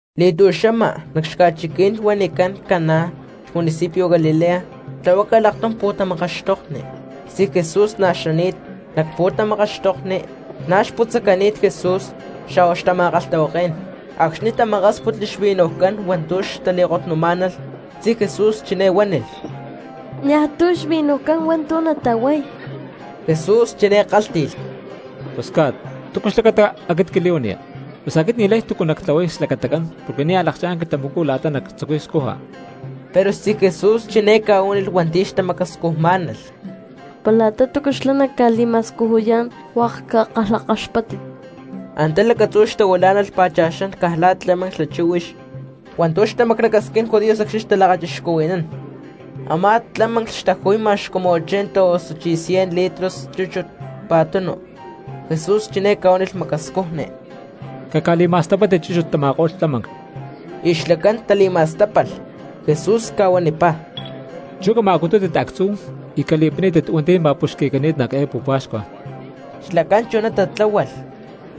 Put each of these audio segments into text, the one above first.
Li̠tu̠xama nac ca̠chiquí̠n huanicán Caná xmunicipio Galilea tlahuácalh aktum pu̠tamakaxtokni. Xtzí Jesús na̠ xani̠t. Nac pu̠tamakaxtokni na̠ xca̠putzacani̠t Jesús xa̠hua xtama̠kalhtahuaké̠n. Acxni̠ tamakásputli xvinujcán hua̠ntu̠ xtali̠kotnumá̠nalh, xtzí Jesús chiné huánilh: —Niajtu̠ xvinujcán hua̠ntu̠ natahuay. Jesús chiné kálhti̠lh: —Mamá, ¿túcu xlacata aquit quili̠huaniya? Pus aquit ni̠lay túcu nactlahuay xlacatacán porque nia̠ lakchá̠n quilhtamacú la̠ta nactzucuy scuja. Pero xtzí Jesús chiné ca̠huánilh hua̠nti̠ xtamacascujmá̠nalh: —Para la̠ta túcu xlá naca̠li̠ma̠scujuyá̠n, hua̠k cakalhakaxpáttit. Antá lacatzú xtahuilá̠nalh pa̠cha̠xán caj la̠ tlámanclh xla chíhuix hua̠ntu̠ xtamaclacasquín judíos acxni̠ xtalakachixcuhui̠nán; a̠má tlámanclh xtaju̠y ma̠x cumu ochenta osuchí cien litros chúchut pa̠tunu. Jesús chiné ca̠huánilh macascujni: —Caca̠li̠ma̠stapátit chúchut tama̠ko̠lh tlámanclh. Y xlacán tali̠ma̠stápalh. Jesús ca̠huanipá: —Chú cama̠cutútit actzú y cali̠pinipítit hua̠nti̠ ma̠puxqui̠cani̠t nac eé pu̠pa̠xcua. Xlacán chuná tatláhualh,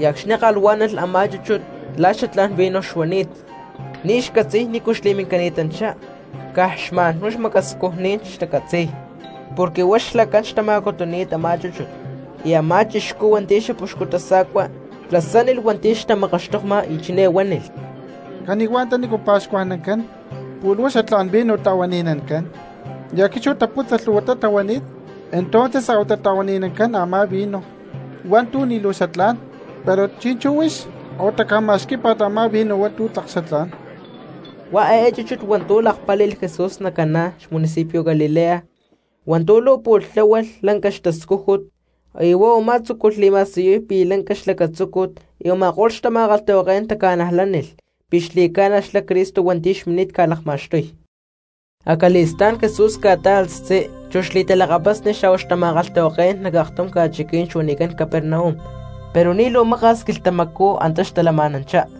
y acxni̠ kalhuá̠nalh a̠má chúchut la̠ xatlá̠n vino xuani̠t, ni̠ xcatzi̠y nícu xli̠mincani̠tanchá caj xma̠nhuá macascujní̠n xtacatzi̠y, porque huá xlacán xtama̠cutuni̠t a̠má chúchut. Y a̠má chixcú hua̠nti̠ xapuxcu tasa̠cua tasánilh hua̠nti̠ xtamakaxtokma, y chiné huánilh: —Cani̠huá antanícu pa̠xcuajnancán pu̠lh huá xatlá̠n vino ta̠huani̠nancán, y acxni̠ taputza lhu̠huatá tahuani̠t, entonces a̠huatá ta̠huani̠nancán a̠má vino hua̠ntu̠ ni̠ luu xatlá̠n. Pero chi̠nchú huix a̠huatá ca̠ma̠xquí̠pa̠t a̠má vino hua̠ntu̠ tlak xatlá̠n. Huá eé chúchut hua̠ntu̠ lakpáli̠lh Jesús nac Caná cxmunicipio Galilea, hua̠ntu̠ luu pu̠lh tláhualh lanca xtascújut, y huá u̠má tzúculh li̠ma̠siyuy pi̠ lanca xlacatzúcut y a̠ma̠ko̠lh xtama̠kalhtahuaké̠n taca̠najlánilh pi̠ xli̠cána xlá Cristo hua̠nti̠ xmini̠t ca̠lakma̠xtuy. Acali̠stá̠n Jesús ca̠tá̠alh xtzí, chu xli̠talakapasni xa̠hua xtama̠kalhtahuaké̠n nac aktum ca̠chiquí̠n xuanicán Capernaum pero ni̠ luu maka̠s quilhtamacú antá xtalama̠nanchá.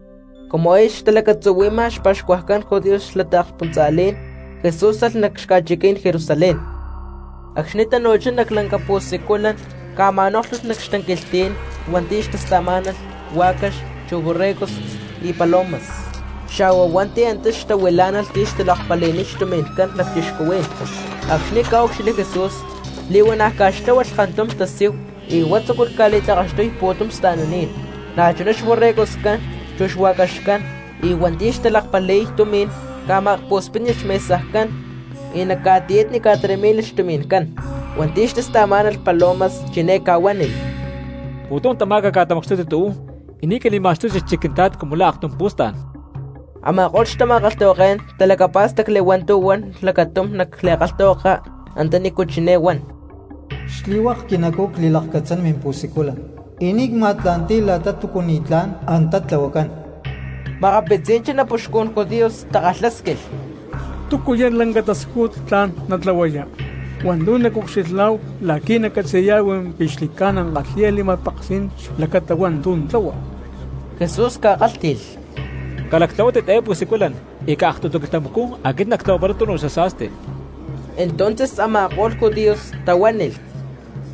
Cumu aya xtalacatzuhui̠ma xpa̠xcuajcán judíos xla taakspuntza̠lí̠n, Jesús alh nac xaca̠chiquí̠n Jerusalén. Acxni̠ tanu̠chá nac lanca pu̠siculan ca̠ma̠nóklhulh nac xtanquilhtí̠n hua̠nti̠ xtasta̠má̠nalh huá̠cax chu borregos y palomas, xa̠hua hua̠nti̠ antá xtahuilá̠nalh tí xtalakpali̠niy xtumi̠ncán cristianos. Acxni̠ ca̠úcxilhli Jesús li̠huana̠ ca̠xtláhualh kantum tasíhu y huá tzúculh ca̠li̠tlakaxtuy pu̠tum sta̠naní̠n, na̠chuná xborregoscán, chu xua̠caxcán; y hua̠nti̠ xtalakpali̠y tumi̠n ca̠ma̠akpu̠spítnilh xmesajcán y nac ca̠tiyatni ca̠taramí̠nilh xtumi̠ncán. Hua̠nti̠ xtasta̠má̠nalh palomas chiné ca̠huánilh: —Pu̠tum tamá caca̠tamacxtútit uú y ni̠ cali̠ma̠xtútit xchic Quintla̠t cumu la̠ aktum pu̠stá̠n. Ama̠ko̠lh xtama̠kalhtahuaké̠n talacapá̠stacli hua̠ntu̠ huan lacatum nac li̠kalhtahuaka antanícu chiné huan: “Xli̠hua̠k quinacú cli̠lakcatzán mimpu̠siculan y ni̠ cma̠tla̠nti̠y la̠ta túcu ni̠tlá̠n antá tlahuacán.” Makapitzí̠n xanapuxcún judíos takalhásquilh: —¿Túcuya̠ lanca tascújut tla̠n natlahuaya hua̠ntu̠ nacucxilhá̠hu la̠qui̠ naccatzi̠yá̠hu pi̠ xli̠ca̠na kalhi̠ya li̠ma̠peksí̠n xlacata hua̠ntu̠ tlahua? Jesús ca̠kálhti̠lh: —Calactlahuátit eé pu̠siculan y caj aktutu quilhtamacú aquit nactlahuaparay tunu xasa̠sti. Entonces a̠ma̠ko̠lh judíos tahuánilh: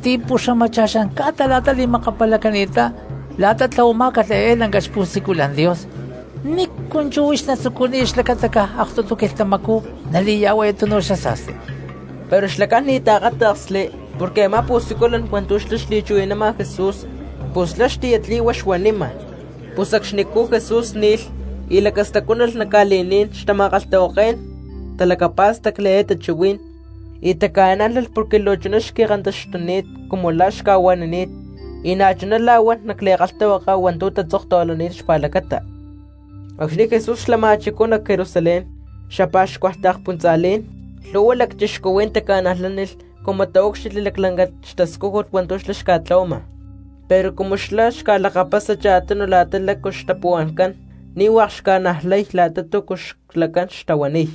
—Ti̠puxamacha̠xán ca̠ta li̠makapalacani̠ttá la̠ta tlahuamá̠calh eé lanca xpu̠siculan Dios, ¿nícu chú huix natzucuniya xlacata caj aktutu quilhtamacú nali̠tlahuaya tunu xasa̠sti? Pero xlacán ni̠ taakáta̠ksli porque a̠má pu̠siculan hua̠ntu̠ xlá xli̠chuhui̠nama Jesús pus xlá xtiyatli̠hua xuanima. Pus acxnicú Jesús ni̠lh y lacastacuánalh nac ca̠li̠ní̠n xtama̠kalhtahuaké̠n talacapá̠stacli eé xtachuhuí̠n y taca̠nájlalh porque luu chuná xqui̠kantaxtuni̠t cumu la̠ xca̠huanini̠t y na̠chuná la̠ huan nac li̠kalhtahuaka hua̠ntu̠ tatzoktahuilani̠t xpa̠lacata. Acxni̠ Jesús xlama̠chicú nac Jerusalén cxapa̠xcua taakspuntza̠lí̠n lhu̠hua cristianos taca̠najlánilh cumu taúcxilhli laclanca xtascújut hua̠ntu̠ xlá xca̠tlahuama. Pero cumu xlá xca̠lakapasa cha̠tunu la̠ta lácu xtapuhua̠ncán ni̠ hua̠k xca̠najlay la̠ta túcu xlacán xtahuaniy.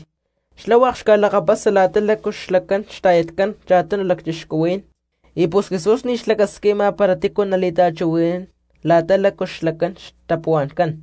Xlá hua̠k xca̠lakapasa la̠ta lácu xlacán xta̠yatcán cha̠tunu cristianos y pus Jesús ni̠ xlacasquima para tícu nali̠ta̠chuhui̠nán la̠ta lácu xlacán xtapuhua̠ncán.